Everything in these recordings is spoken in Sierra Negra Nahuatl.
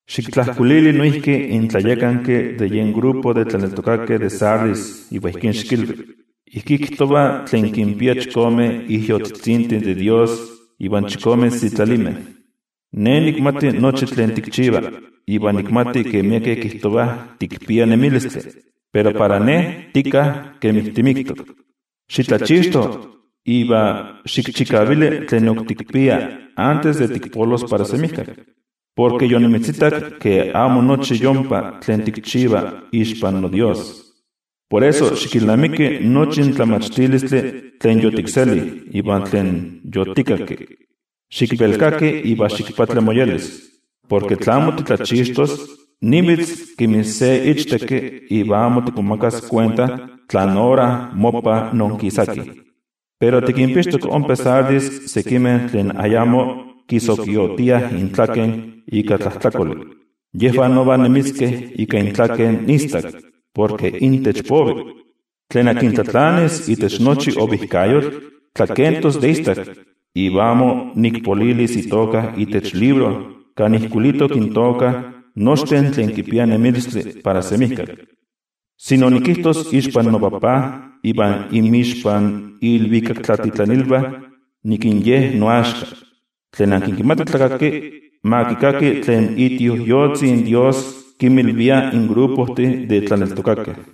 ’Xiktlajkuilili noijki in tlayakanki de yen olololistli de tlaneltokakeh de Sardis iva ijkí xikilvi: “Ijkí kijtova tlen kinpia chikome ijyotzitzintih de Dios iva chikome sitlalimeh: Ne nikmati nochi tlen tikchiva, iva nikmati ke miekeh kijtovah tikpia nemilistli, pero para Ne tika kemi timiktok. Xitlachixto, iva xikchikavili tlen ok tikpia antes de tikpolos para semijkak. Porke yonimitzitak ke amo nochi yompa tlen tikchiva ixpan noDios. Por eso, xikilnamiki nochi in tlamachtilistli tlen yotikseli iva tlen yotikakki. Xikvelkaki iva ximoyolkuapa. Porke tla amo titlachixtos, nivitz kemi se ichtekki iva amo tikmomakas kuenta tlán ora mopa noonkisaki. Pero tikinpixtok ompa Sardis sekimeh tlen ayamo kisokiotiah intlaken ika tlajtlakoli. Yejvah nova nemiskeh ika intlaken istak, porke intech povi. Tlen tlatlanis itech nochi ovijkayotl, tlakentos de istak, iva amo nikpopolilis itoka itech libro kan ijkuilitok intoka nochtin tlen kipiah nemilistli para semijkak, sino nikijtos ixpan noTajtzi iva inmixpan iilvikaktlatitlanilvah nik ye noaxka. Tlen kimati tlakaki, ma kikaki tlen iTioijyotzi in Dios kinmilvia in olololistih de tlaneltokakeh.”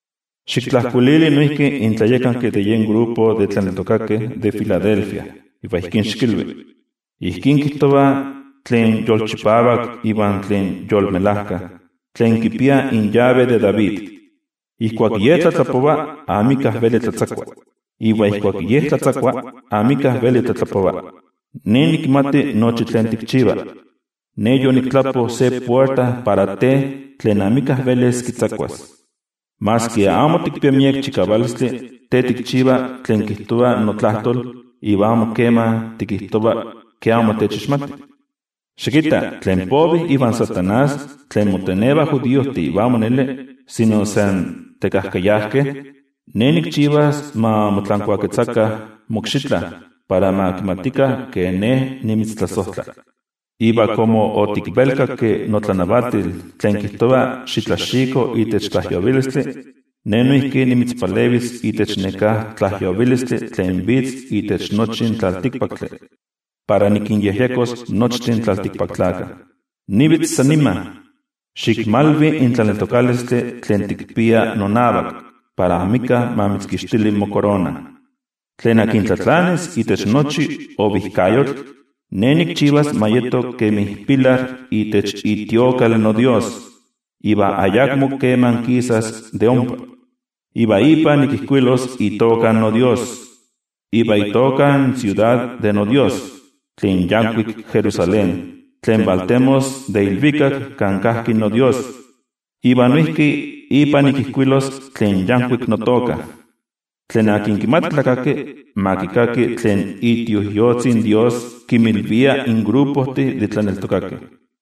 ’Xiktlajkuilili noijki in tlayakanki de yen olololistli de tlaneltokakeh de Filadelfia iva ijkí xikilvi: “Ijkí kijtova tlen Yolchipavak iva tlen Yolmelajka, tlen kipia in yave de David. Ijkuak Ye tlatlapova, amika veli tlatzakua. Iva ijkuak Ye tlatzakua, amika veli tlatlapova: Ne nikmati nochi tlen tikchiva. Ne yoniktlapo se puerta para te tlen amika velis kitzakuas. Maski amo tikpia miek chikavalistli, te tikchiva tlen kijtova notlajtol, iva amo keman tikijtova ke amo techixmati. Xikitta, tlen povih ivan Amo Kuali Tlakatl, tlen motenevah judiojtih iva amo neli, sino san tekajkayajkeh, Ne nikchivas ma motlankuaketzakah mokxitla, para ma kimatikah ke Ne nimitztlasojtla. Iva komo otikvelkakki notlanavatil tlen kijtova xitlaxiko itech tlajyovilistli, Ne noijki nimitzpalevis de itech neká tlajyovilistli tlen vitz itech nochi in tlaltikpaktli, para nikinyejyekos nochtin in tlaltikpaktlakah. Nivitz san nima. Xikmalvi in tlaneltokalistli tlen tikpia nonavak, para amika ma mitzkixtili mokorona. Tlen tlatlanis itech nochi ovijkayotl, Ne nikchivas ma yeto kemi pilar itech itemplo noDios, iva ayakmo keman kisas de ompa. Iva ipa nikijkuilos itoka noDios, iva itoka in siudad de noDios, tlen yankuik Jerusalén tlen valtemos de ilvikak kan kajki noDios. Iva noijki ipa nikijkuilos tlen yankuik notoka. Tlen kimati tlakaki, ma kikaki tlen iTioijyotzi in Dios kinmilvia in olololistih de tlaneltokakeh.”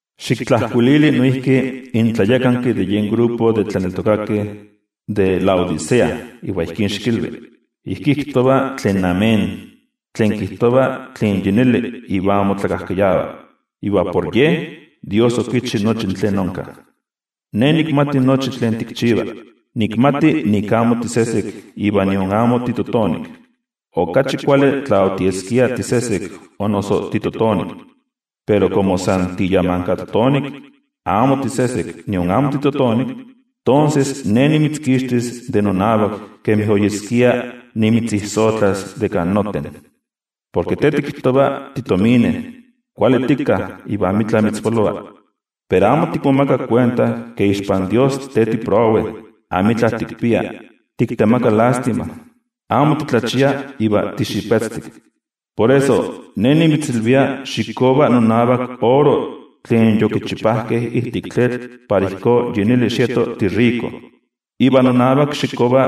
’Xiktlajkuilili noijki in tlayakanki de yen olololistli de tlaneltokakeh de Laodicea iva ijkí xikilvi: “Ijkí kijtova tlen Amén, tlen kijtova tlen yi neli iva amo tlakajkayava, iva por Ye, Dios okichi nochi tlen onka: Ne nikmati nochi tlen tikchiva. Nikmati nik amo tisesek iva nion amo titotonik. Okachi kuali tla otieskia tisesek o noso titotonik. Pero komo san tiyamankatotonik, iva amo tisesek nion amo titotonik, tonses Ne nimitzkixtis de nonavak kemi oyeskia nimitzijsojtlas de kan noten. Porke te tikijtova titomine, kuali tika iva amitla mitzpolova. Pero amo tikmomaka kuenta ke ixpan Dios te tiprowe, amitla tikpia, tiktemaka lástima, amo titlachia iva tixipetztik. Por eso, Ne nimitzilvia xikkova nonavak oro tlen yokichipajkeh ijtik tlitl para ijkó yi neli xieto tiriko. Iva nonavak xikkova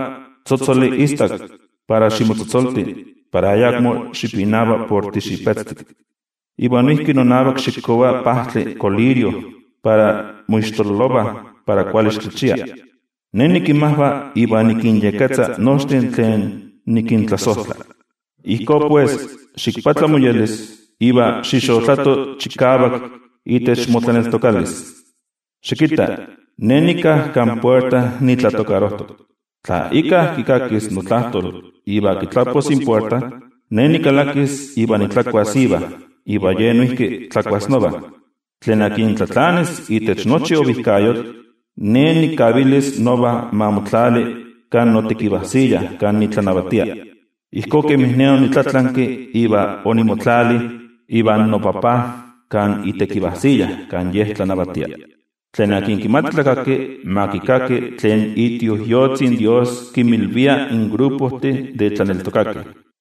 tzotzoli istak para ximotzotzolti para ayakmo xipinava por tixipetztik. Iva noijki nonavak xikkova pajtli kolirio para moixtololovah para kuali xitlachia. Ne nikinmajva iva nikinyekketza nochtin tlen nikintlasojtla. Ijkó pues, ximoyolkuapa iva xixotlato chikavak itech motlaneltokalis. Xikitta. Ne nika kan puerta nitlatokarojtok. Tla íkka kikakis notlajtol iva kitlapos in puerta, Ne nikalakis iva nitlakuas iva, iva ye noijki tlakuas nova. Tlen tlatlanis itech nochi ovijkayotl, Ne nikavilis nova ma motlali kan notekivajsiya kan nitlanavatia, ijkó kemin Ne onitlatlanki iva onimotlali ivan noTajtzi kan itekivajsiya kan Ye tlanavatia. Tlen kimati tlakaki, ma kikaki tlen iTioijyotzi in Dios kinmilvia in olololistih de tlaneltokakeh.”